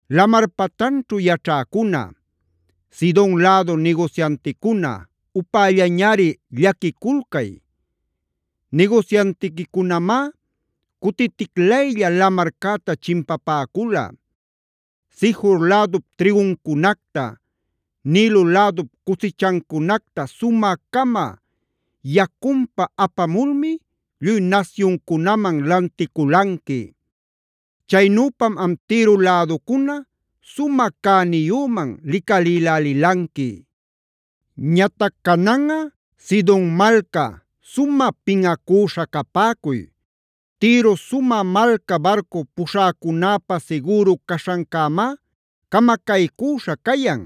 Lamar patanćhu yaćhäcuna, Sidon lädu nigusyanticuna upällañari llaquiculcay. Nigusyantiquicunamá cutiticlaylla lamarcäta chimpapäcula. Sijor lädup trïguncunacta, Nilo lädup cusichancunacta sumä-cama yacunpa apamulmi, lluy nasyuncunaman lanticulanqui. Chaynüpam am Tiro läducuna sumä cäniyüman licalïlälilanqui. Ñatac cananꞌa, Sidon malca, sumä pinꞌacüśha capäcuy. Tiro sumä malca barcu puśhäcunäpa sigüru caśhancämá camacaycüśha cayan;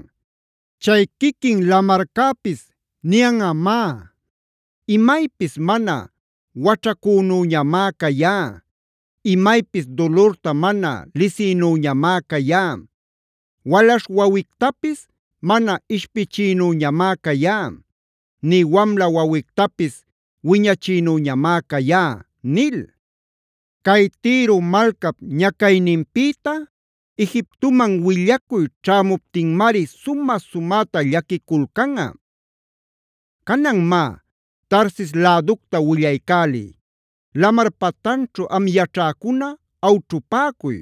chay quiquin lamarcäpis niyanꞌamá: “Imaypis mana waćhacünüñamá cayá; imaypis dulurta mana lisïnüñamá cayá. Walaśh wawictapisc mana ishpichïnüñamá cayá, nï wamla wawictapis wiñachïnüñamá cayá” nil. Cay Tiro malcap ñacayninpïta Egiptoman willacuy ćhämuptinmari sumä-sumäta llaquiculcanꞌa. Canan má, Tarsis läducta willaycäliy. Lamar patanćhu am yaćhäcuna awćhupäcuy.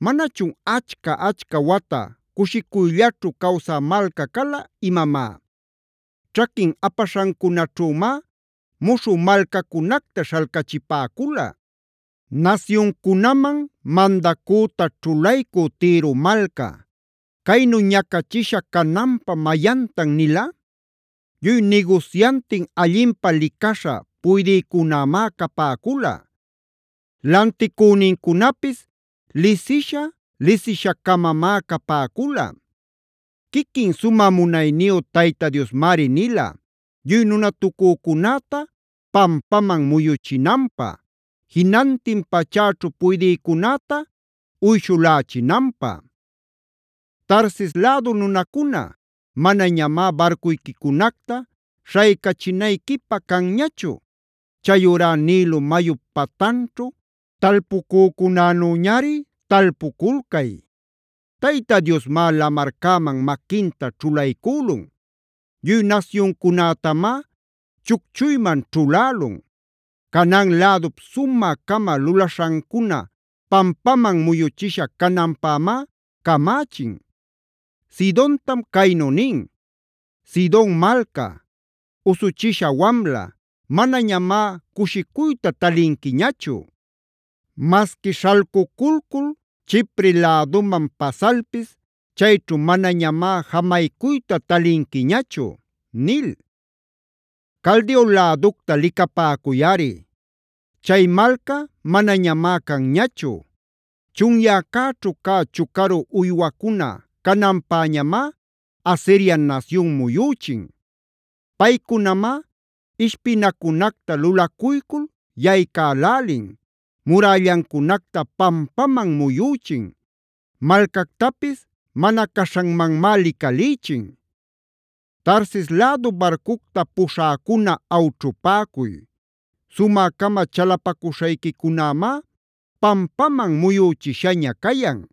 ¿Manachun achca-achca wata cushicuyllaćhu cawsä malca cala imamá? Ćhaquin apaśhancunaćhümád muśhü malcacunacta śhalcahipäcula. Nasyuncunaman mandacüta ćhulaycü Tiro malca, ¿caynu ñacachisha cananpä mayantan nila? Lluy nigusyantin allinpä licaśha puydïcunamá capäcula; lanticünincunapis lisisha lisisha-camamá capäcula. Quiquin sumä munayniyu Tayta Diosmari nila, lluy nunatucücunäta pampaman muyuchinanpä; jinantin pachäćhu puydïcunäta uyshulächinanpä. Tarsis lädu nunacuna, manañamá barcuyquicunacta śhaycachinayquipä canñachu. Chayurá Nilo mayup patanćhu talpucücunänüñari talpuculcay. Tayta Diosmá lamarcäman maquinta ćhulaycülun; lluy nasyuncunätamá chucchuyman ćhulälun. Canaan lädup sumä-cama lulaśhancuna pampaman muyuchisha cananpämá camächin. Sidontam caynu nin: “Sidon malca, usuchisha wamla, manañamá cushicuyta talinquiñachu. Masqui śhalcuculcul Chipree läduman pasalpis, chayćhu manañamá jamaycuyta talinquiñachu” nil. Caldeo läducta licapäcuyꞌari. Chay malca manañamá canñachu. Chunyäcäćhu cä chucaru uywacuna cananpäñamá, Asiria nasyun muyüchin. Paycunamá ishpinacunacta lulacuycul yaycälälin; murällancunacta pampaman muyüchin; malcactapis mana caśhanmanmá licalïchin. ¡Tarsis lädu barcucta puśhäcuna awćhupäcuy! Sumä-cama chalapacuśhayquicunämá pampaman muyüchishaña cayan.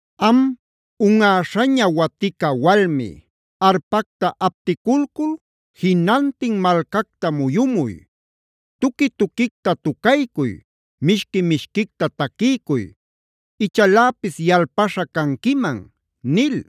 “Am, unꞌäśhaña watica walmi, arpacta apticulcul jinantin malcacta muyumuy. Tuqui-tuquicta tucaycuy, mishqui-mishquicta taquiycuy; ichaläpis yalpaśha canquiman” nil.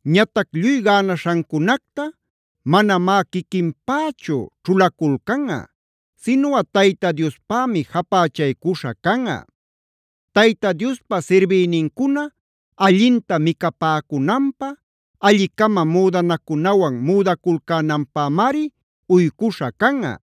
Ñatac lluy gänaśhancunacta manamá quiquinpächu ćhulaculcanꞌa sinuꞌa Tayta Diospämi japächaycuśha canꞌa. Tayta Diospa sirbïnincuna allinta micapäcunanpä, alli-cama müdanacunawan müdaculcänanpämari uycuśha canꞌa.